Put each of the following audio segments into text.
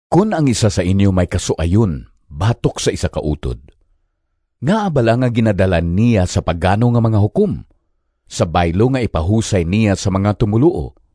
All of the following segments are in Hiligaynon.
Kon ang isa sa inyo may kasuayon batok sa isa ka utod, ngaa bala nga ginadala niya sa pagano nga mga hukom, sa baylo nga ipahusay niya sa mga tumoluo?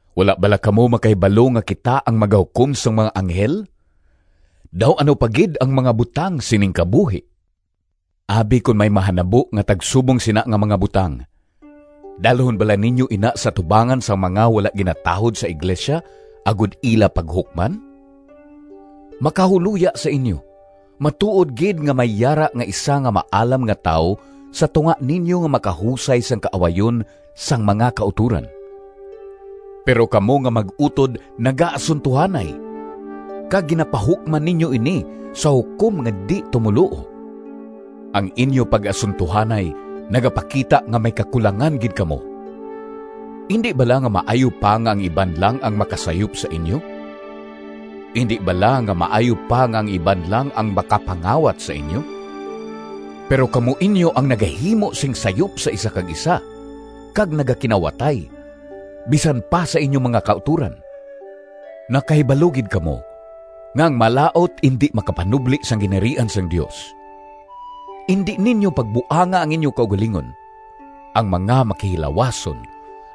Wala bala kamo makahibalo nga kita ang magahukom sang mga anghel? Daw ano pa gid ang mga butang sining kabuhi! Abi kon may mahanabo nga tagsubong sina nga mga butang, dalhon bala ninyo ina sa atubangan sang mga wala ginatahod sa iglesia agod ila paghukman? Makahuloya sa inyo! Matuod gid nga may yara nga isa nga maalam nga tawo sa tunga ninyo nga makahusay sang kaawayon sang mga kautoran! Pero kamo nga mag-utod nagaasuntohanay, kag ginapahukman ninyo ini sa hukom nga di-tumoluo! Ang inyo pag-asuntohanay nagapakita nga may kakulangan gid kamo. Indi bala nga maayo pa nga ang iban lang ang makasayop sa inyo? Indi bala nga maayo pa nga ang iban lang ang makapangawat sa inyo? Pero kamo inyo ang nagahimo sing sayop sa isa kag isa, kag nagakinawatay, bisan pa sa inyo mga kautoran! Nakahibalo gid kamo nga ang malaut indi makapanubli sang Ginharian sang Dios. Indi ninyo pagbuanga ang inyo kaugalingon! Ang mga makihilawason,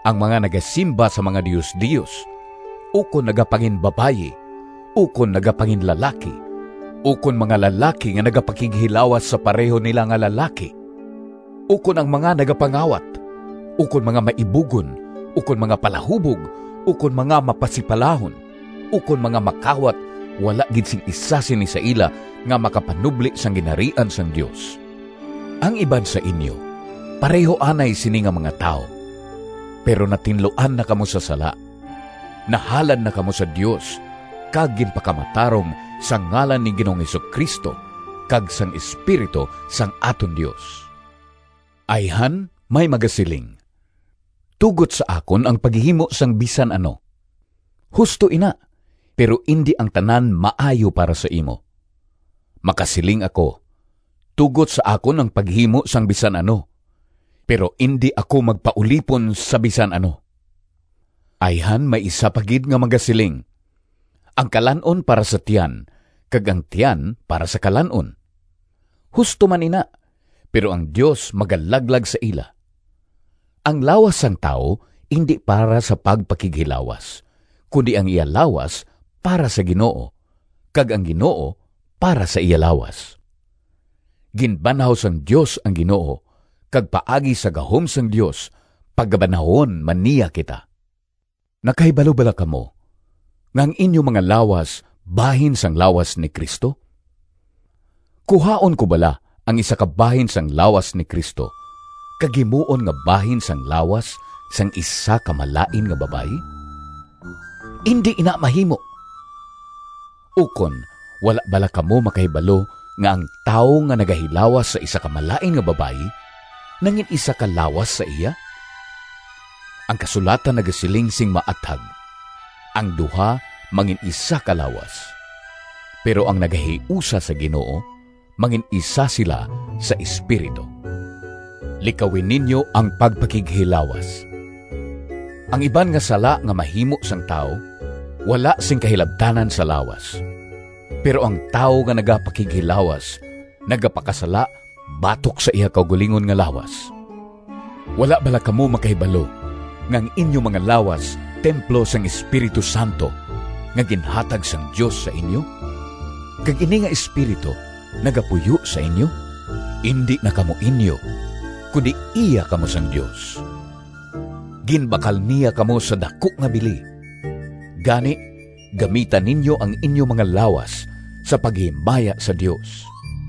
ang mga nagasimba sa mga diosdios, ukon nagapanginbabayi, ukon nagapanginlalaki, ukon mga lalaki nga nagapakighilawas sa pareho nila nga lalaki, ukon ang mga nagapangawat, ukon mga maibugon, ukon mga palahubog, ukon mga mapasipalahon, ukon mga makawat, wala gid sing isa sini sa ila nga makapanubli sang Ginharian sang Dios. Ang iban sa inyo pareho anay sini nga mga tawo. Pero natinluan na kamo sa sala. Nahalad na kamo sa Dios kag ginpakamatarong sa ngalan ni Ginoong Jesu-Cristo kag sang Espiritu sang aton Dios. Ayhan may magasiling, “Tugot sa akon ang paghimo sang bisan ano.” Husto ina, pero indi ang tanan maayo para sa imo. Makasiling ako, “Tugot sa akon ang paghimo sang bisan ano,” pero indi ako magpaulipon sa bisan ano. Ayhan may isa pa gid nga magasiling, “Ang kalan-on para sa tiyan kag ang tiyan para sa kalan-on.” Husto man ina, pero ang Dios magalaglag sa ila. Ang lawas sang tawo indi para sa pagpakighilawas, kundi ang iya lawas para sa Ginoo, kag ang Ginoo para sa iya lawas. Ginbanhaw sang Dios ang Ginoo, kag paagi sa gahom sang Dios pagabanhawon man niya kita. Nakahibalo bala kamo nga ang inyo mga lawas bahin sang lawas ni Cristo? Kuhaon ko bala ang isa ka bahin sang lawas ni Cristo kag himuon nga bahin sang lawas sang isa ka malain nga babayi? Indi ina mahimo! Ukon, wala bala kamo makahibalo nga ang tawo nga nagahilawas sa isa ka malain nga babayi nangin-isa ka lawas sa iya? Ang kasulatan nagasiling sing maathag, “Ang duha mangin-isa ka lawas.” Pero ang nagahiusa sa Ginoo mangin-isa sila sa espiritu. Likawi ninyo ang pagpakighilawas. Ang iban nga sala nga mahimo sang tawo wala sing kahilabtanan sa lawas, pero ang tawo nga nagapakighilawas nagapakasala batok sa iya kaugalingon nga lawas. Wala bala kamo makahibalo nga ang inyo mga lawas templo sang Espiritu Santo nga ginhatag sang Dios sa inyo, kag ini nga Espiritu nagapuyo sa inyo? Indi na kamo inyo, kundi iya kamo sang Dios. Ginbakal niya kamo sa daku nga bili. Gani, gamita ninyo ang inyo mga lawas sa paghimaya sa Dios.